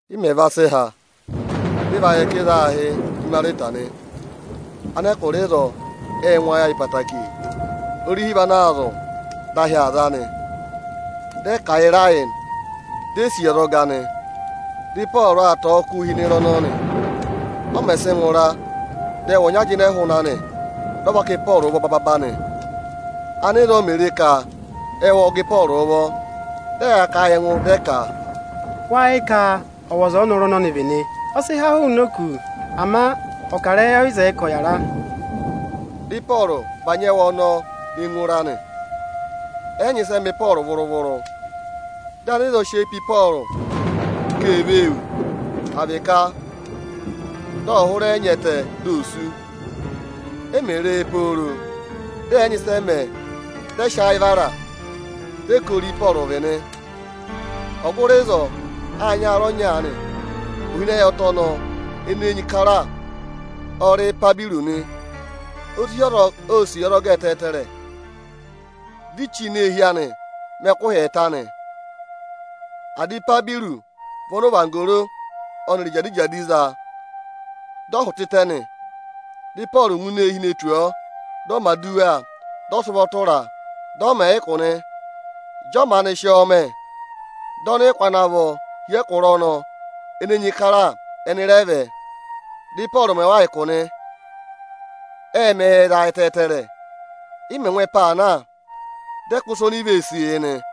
Ị mẹ̀ va sị há, dị ị va yẹ ka ịzọọ aā hị́ Imarita nị. Anẹkụra ịzọọ ệ ngụ ayị ayị ẹtẹẹtẹrẹ. Orihi vị ana aa zụ̀, dị ahị aa za nị. Ẹnịnị ệ kà ịra yị, di e sì yi ọzọga nị. Dị Ịpọọrụ aa tọ̀ọ́ ọkụ hi ịnị ịra ọnọọ nị. Ọ mẹ̀ sị ngụra, dị ẹwụ ọnya jịnẹ hụụnị anị, dị ọ para Ịpọọrụ ụvọ bababa nị. Ánịzọọ mè re ka ẹwụ ộ gẹ Ịpọọrụ ụvọ, dị ẹyaa kà a yị ẹngụ, dị ẹ ka, “Wáá yẹ ka ọwọza ọ́nọrụ ọnọnị vị nị? Ọ sị há hụụnị òkū, ama ọkarẹyị ọ yị zẹẹ ka ọ̀ yàra.” Dị Ịpọọrụ bànyị ẹwụ ọnọọ ne ngụ ịra nị. Ẹ yị nyị ịsị ẹ mẹ̀ Ịpọọrụ vụrụ-vụrụ. Dị anịzọọ sị eyi pe Ịpọọrụ ka ee vee wù, à vị ka dị ọ̀ hụrẹ nya ẹtẹ di ò sú nị. E mè re e pooro, dị ẹ̀ yị nyị ịsị ẹ mẹẹ, dị ẹ sị ayị vara, dị ẹ ka ori Ị́pọọrụ vị nị. Ọgụrị ịzọọ â nyị aarẹ ọnya aanị. Ohinọyị ẹtẹ ọnọọ ene enyi kara ọ rị Ipaburu nị. Ohinọyị ọnọọ ọ nyị aarẹ ọnọọ nị. Ô sì yi ọzọga ẹtẹẹtẹrẹ, di i chí ini eehi anị mẹ ẹkụhị ẹẹta nị. Ada Ipaburu vị ọnị ọvanggoro ọnịrị ijadijadi za, dị ọ hụtẹtẹẹ nị. Dị Ịpọọrụ ngụ ini eehi ne tù ọọ, dị ọ mẹ̀ aduwa, dị ọ sị ụvọ tụra a, dị ọ mẹ̀ ẹ ụkụ nị. Ịjị ọ maanị sị ọnọọ mẹ, dị ọnịkụ ana vọ hi ẹkụra ene enyi kara aanị, ẹnị rẹ vẹ, dị Ịpọọrụ mẹ wa ụkụ nị. Ệ mẹ yị ẹyịza ẹtẹẹtẹrẹ. Ị mẹ̀ ngụ ẹpa aa na, dị ẹ kụ́ ịsa oni i vee sìi yị nị.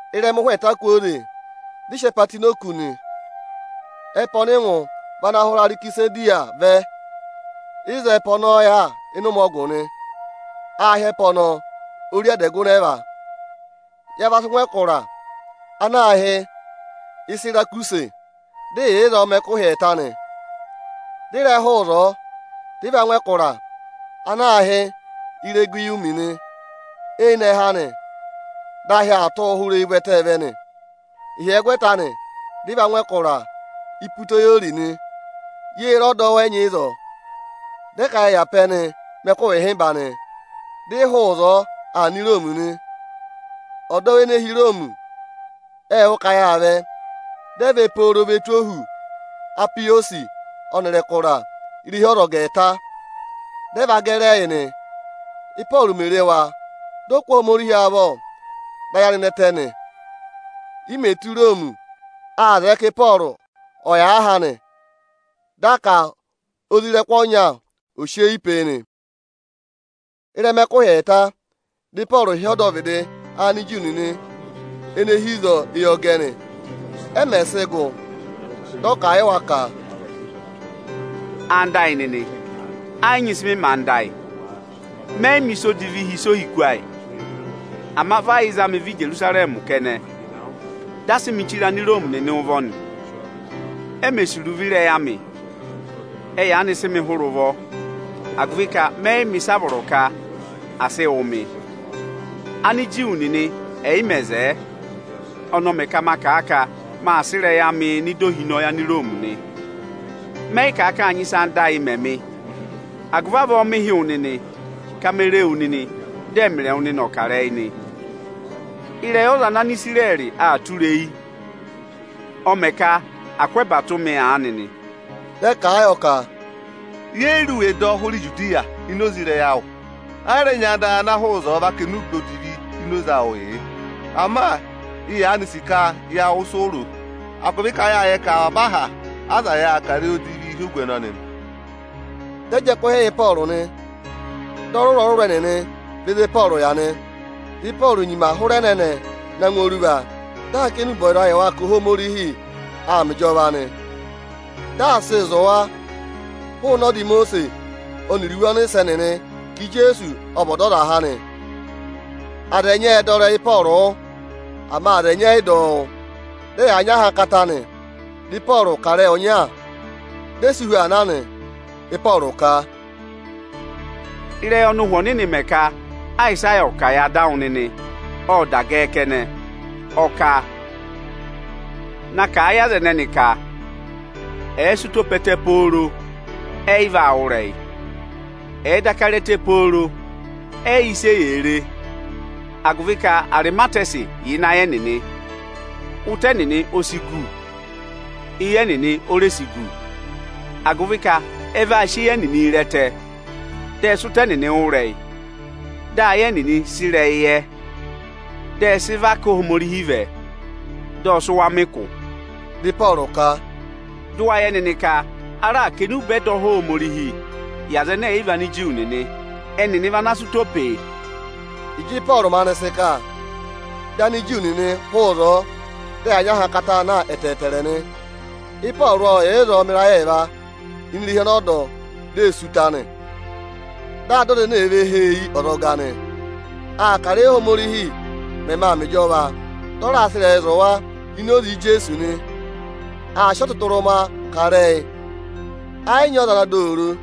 Ịrẹma ụhwẹ ẹẹta kwooze, dị ị sị ẹpa tụ́ ini òkū nị. Ẹpa ọnị ị ngụ vị ana hụrẹ Arekisandiriya vẹ. Ịzọọ ẹ́pa ọnọọ yà ịnị ụmẹ ọgụ nị. Aā hị́ ẹpa ọnọọ “Ori adẹgụnẹva”. Ya va sị ngụ ẹkụra ana aā hị́ Isirakusi, dị ị yà ịzọọ mẹ ẹkụhị ẹẹta nị. Dị ị rẹ hụụ ịzọọ, dị ị va ngụ ẹkụra ana aā hị́ Iregiyumi nị. Eyinẹhẹ anị dị ahị aa tụ́ hụrẹ eyi ụvẹtẹẹ vẹ nị. Ịhyẹgwẹta anị, dị ị va ngụ ẹkụra Iputeyori nị. Yê re ọdọwụ ẹnyị ịzọọ, dị ẹ ka ya yà pe ẹnị mẹ ẹkụhị ịhịmba nị. Dị ị hụụ ịzọọ aa nọ Iroomi nị. Ọdọwụ ene hi Iroomi ệ wụ́ ka yaa vẹ, dị ẹ vẹ pooro ve tù ohu Apiyọsị ọnịrị ẹkụra “Irehi aha ọyịchi ẹẹta”, dị ẹ va gẹrị ẹyị nị. Ị́pọọrụ mè re wa, ộ kụ́ Ohomorihi avọ, dị ayị anị nẹtẹ nị. I mè tù Iroomi, â zẹẹ ka Ịpọọrụ ọ̀ yà aha anị. Dị a ka isoja ọnya ọ̀ sị eyi pe e nị. Ịrẹma ẹkụhị ẹẹta, dị Ịpọọrụ hị́ ọdọvịdị Aniju nịnị ene hi ịzọọ eyọgẹ nị. Ẹ mẹ̀ sị gụ, dị ọ kà a yị wa ka, “Ẹwụ nịnị ẹyịnyara amị, ẹ yị nyị ịsị ọnị mẹ anda ayị, Ọnị ẹ yị mẹ̀ ịsa odivi hi ịsa ohiku ayị. Ama vị ẹ yị za ọnị Íjerusarẹmị kẹnẹ, dị a sị ọnị chire Aniroomi nịnị ụvọ nị. E mè sì iruvo ịrẹyị anị, ẹ yaanị sị ọnị hụrẹ ụvọ, agụvị ka ọnị yị mẹ ịsị a vọrọ ka à sị wụ ọnị. Ániju nịnị ẹ̀ yị mẹ̀ zẹẹ, ọnị ọ mẹ ka ọnị ọ̀ kà a ka ọnị aa sị ịrẹyị anịị nọ ịda ohinọyị Aniroomi nị. Ọnị ẹ yị kà ka â nyị ịsị anda ayị mẹ̀ ọnị. Ọ kà agụvị avọọ ọnị hị́ wa, ka ọnị o re wa, dị ọnịrị wa è dudu kà ịrẹyị nị. Ịrẹyị ọza ana Anisirẹrị aa tụra eyi, ọ mẹ ka à kụ́ ẹba tụ́ ọnị aanị nị.” Dị ẹ kà a yọ ka: “Ẹnị è yi re iwe dọ hụrẹ Ijudiya ini oze ịrẹyị anị, ẹ yị rẹ nyị anda ẹnịnị ana hụụ ịzọọ va kà enube odivi ini oze anị yị ẹnị. Ama ẹnị yaanị sì ka ya wụ́ ịsị Ịpọọrụ ro, agụvị ka ẹnị ẹ́ yẹ ka avaba aha aza yà aa kà ịrẹyị odivii hi ogu ọnọnị nị.” Dị ẹ jị ẹkụhị yị Ịpọọrụ nị, dị ọrụrụ-ọrụrụ ẹnịnị vẹ ịzị Ịpọọrụ yà nị. Ịpọọrụ ô nyima hụrẹ ẹnẹnẹ na ngụ oruva, dị aa kà enube ọyịzaa yị wa ka Ohomorihi aa mẹ ịjọva nị. Dị aa sịị zụ̀ wa hụụnị ọda Imosiisi ọnịrị iwe ọnịsẹ nịnị ka Ijeesu ọ vị Ọdọzaha nị. Aza ẹnyị ệ dọ ịrẹyị Ịpọọrụ wụ́, ama aza ẹnyị ẹyị dọ ọ wụ́. Ẹnịnị ê pe ẹngụ nyị ahankata. Dị Ịpọọrụ kà ịrẹyị ọnya, di e si hu aa na nị. Ịpọọrụ ka, “Ịrẹyị ọnị Ụhwẹ Ọnịnị mẹ ka Ayịsaya ọ̀ kà yị ada awụ nịnị, ộ da gẹẹ kẹnẹ.” Ọ kà, “Na kà a yị aza ẹnẹnị, ka ẹ̀ẹ sị ụtọ pe ẹtẹ pooro, ẹyị vaa wụ́ ịrẹyị. Ẹ̀ẹ daka re ẹtẹ pooro, ẹyị yẹ ịsị eyee re. Agụvị ka arịmatẹsị yà ịnị ayị ẹnịnị, ụtọ ẹnịnị o si gu, eyi ẹnịnị o re si gu. Agụvị ka ẹ va sị eyi ẹnịnị re ẹtẹ, dị ẹ sị ụtọ ẹnịnị wụ́ ịrẹyị, dị ayị ẹnịnị sị ịrẹyị yẹ, dị ẹ zị và ká Ohomorihi vẹ, dị ọ sị wa mẹ ụkụ.” Dị Ịpọọrụ ka, “Dụ wa yẹ nịnị ka a raà kà enube ẹdọha Ohomorihi yị Anigiriki nịnị. Ẹnịnị vaa sị ụtọọ pee!” [Ịjị Ịpọọrụ maanị sị kà, dị Aniju nịnị hụụ ịzọọ, dị ẹyaa nyị ahankataa na ẹtẹẹtẹrẹ nị.] Ịpọọrụ ộ yà ịzọọ mẹ ịrayị ẹẹva ini irehi ọnọọ dọ di ee sí ụta anị. Dị aa dọ aza ene èe ve hee yi ọzọga nị. Aa kà ịrẹyị, Óhomorihi mẹmẹ aa mẹ ịjọva, dị ọ raa sị ịrẹyịị zụ̀ wa ini oze Ijeesu nị. Aa sị ọtụtụrụma kà ịrẹyị, ẹ yị nyị ọza ana dọ ọ oro.